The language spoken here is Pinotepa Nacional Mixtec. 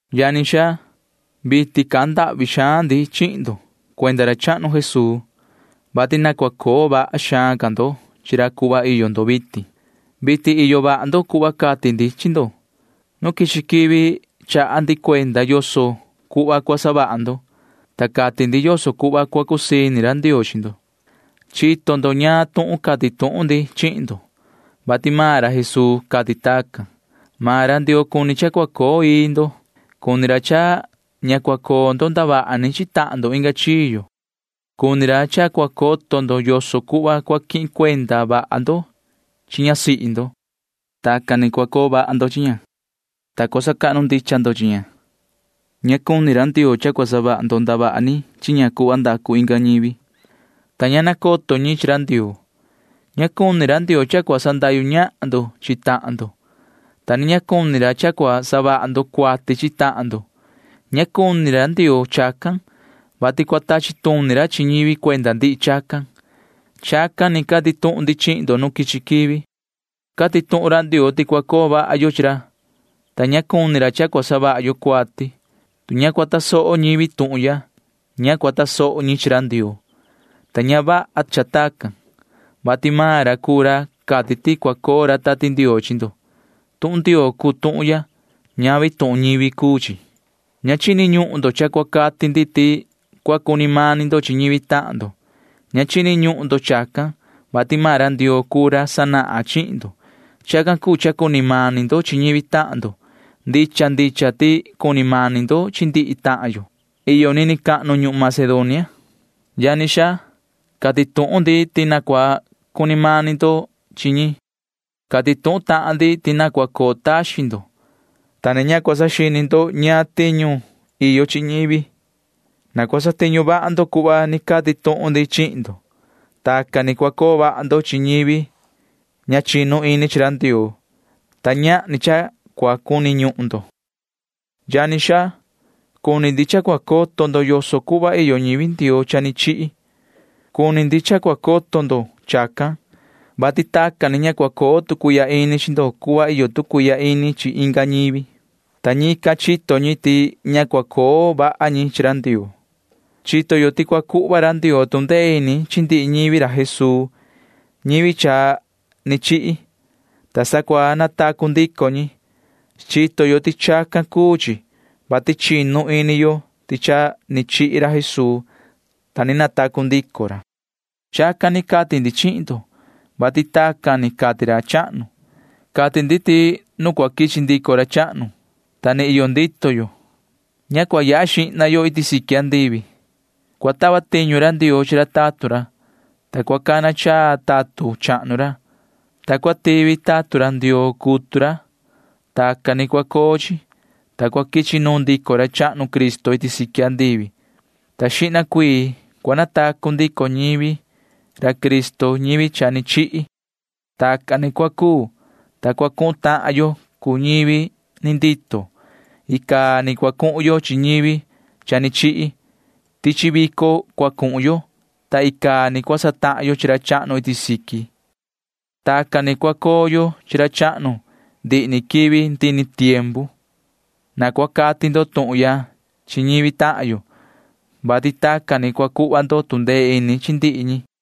Yani xaa, vitin cahan ndahvi xaan ndi chihin ndo cuenda ra chahnu Jesuu, vati na cua coo vaha xaan ca ndo chi ra cuhva iyo ndo vitin. Vitin iyo vaha ndo cuhva cati ndi chi ndo. Nu quichi quivi chaha ndi cuenda yoso cuhva cua savaha ndo, ta cati ndi yoso cuhva cua cusii ini ra Ndioo chi ndo. Chito ndo ñaan tuhun cati tuhun ndi chihin ndo, vati maan ra Jesuu cati tacan ni. Maan ra Ndioo cuni cha cua coo ii ndo. Cuni ra cha ña cua coo ndo ndavaha ni chi tahan ndo inga chiyo. Cuni ra cha cua coto ndo yoso cuhva cua quihin cuenda vaha ndo chi ñasihi ndo. Tacan ni cua coo vaha ndo chi ña, ta cua sacahnu ndicha ndo chi ña. Ña cuni ra Ndioo cha cua savaha ndo ndavaha ni chi ña cuhva ndacu inga ñivi, ta ña nacoto ñi chi ra Ndioo. Ña cuni ra Ndioo cha cua sandahyu ñahan ndo chi tahan ndo, ta ni ña cuni ra cha cua savaha ndo cuati chi tahan ndo. Ña cuni ra Ndioo chacan, vati cua tachi tuni ra chi ñivi cuenda ndihi chacan. Chacan ni cati tuhun ndi chihin ndo nu quichi quivi. Cati tuhun ra Ndioo ti cua coo vaha yo chi ra, ta ña cuni ra cha cua savaha yo cuati. Tu ña cua tasoho ñivi tuhun ya, ña cua tasoho ñi chi ra Ndioo, ta ña vaha cha tacan, vati maan ra cuu ra cati ti cua coo ra Tati Ndioo chi ndo. Tuhun Ndioo cuu tuhun ya. Ñavi tuhun ñivi cuu chi. Ña chini ñuhun ndo cha cua cati ndi ti cua cuni mani ndo chi ñivi tahan ndo. Ña chini ñuhun ndo chacan, vati maan ra Ndioo cuu ra sanahan chihin ndo. Chacan cuu cha cuni mani ndo chi ñivi tahan ndo. Ndicha ndicha ti cuni mani ndo chi ndihi tahan yo iyo nini cahnu ñuhun Macedonia. Yani xaa, cati tuhun ndi ti na cua cuni mani ca ndo chi ñi. Cati tuhun tahan ndi ti na cua coo taxin ndo, ta na ña cua saxini ndo ñaan tiñu iyo chi ñivi. Na cua satiñu vaha ndo cuhva ni cati tuhun ndi chihin ndo. Tacan ni cua coo vaha ndo chi ñivi ña chinu ini chi ra Ndioo, ta ñahni cha cua cuni ñuhun ndo. Yani xaa, cuni ndi cha cua coto ndo yoso cuhva iyo ñivi Ndioo cha ni chihi. Cuni ndi cha cua coto ndo chacan, vati tacan ni ña cua coo tu cuihya ini chi ndo cuhva iyo tu cuihya ini chi inga ñivi, ta ñican chito ñi ti ña cua coo vaha ñi chi ra Ndioo. Chito yo ti cua cuhva ra Ndioo tu ndee ini chi ndihi ñivi ra Jesuu ñivi cha ni chihi, ta sa cua natacu ndico ñi. Chito yo ti chacan cuu chi, vati chinu ini yo ti cha ni chihi ra Jesuu, ta ni natacu ndico ra. Chacan ni cati ndi chihin ndo, vati tacan ni cati ra chahnu. Cati ndi ti nu cua quichi ndico ra chahnu, ta ni vii iyo ndito yo, ña cua yaha xihna yo iti siqui andivi. Cua tava tiñu ra Ndioo chi ra tatun ra, ta cua cana chaa ra tatun chahnu ra, ta cua tivi ra tatun Ndioo cutu ra. Tacan ni cua coo chi, ta cua quichi nuun ndico ra chahnu Cristo iti siqui, ta xihna cuii cua natacu ndico ñivi ra Cristo ñivi cha ni chihi. Tacan ni cua cuu, ta cua cuhun tahan yo cuu ñivi ni ndito. Icaa ni cua cuhun yo chi ñivi cha ni chihi. Tichi vico cua cuhun yo, ta icaa ni cua satahan yo chi ra chahnu iti siqui can. Tacan ni cua coo yo chi ra chahnu ndihi ni quivi ndihi ni tiempu. Na cua cati ndo tuhun ya chi ñivi tahan yo, vati tacan ni cua cuhva ndo tu ndee ini chi ndihi ñi.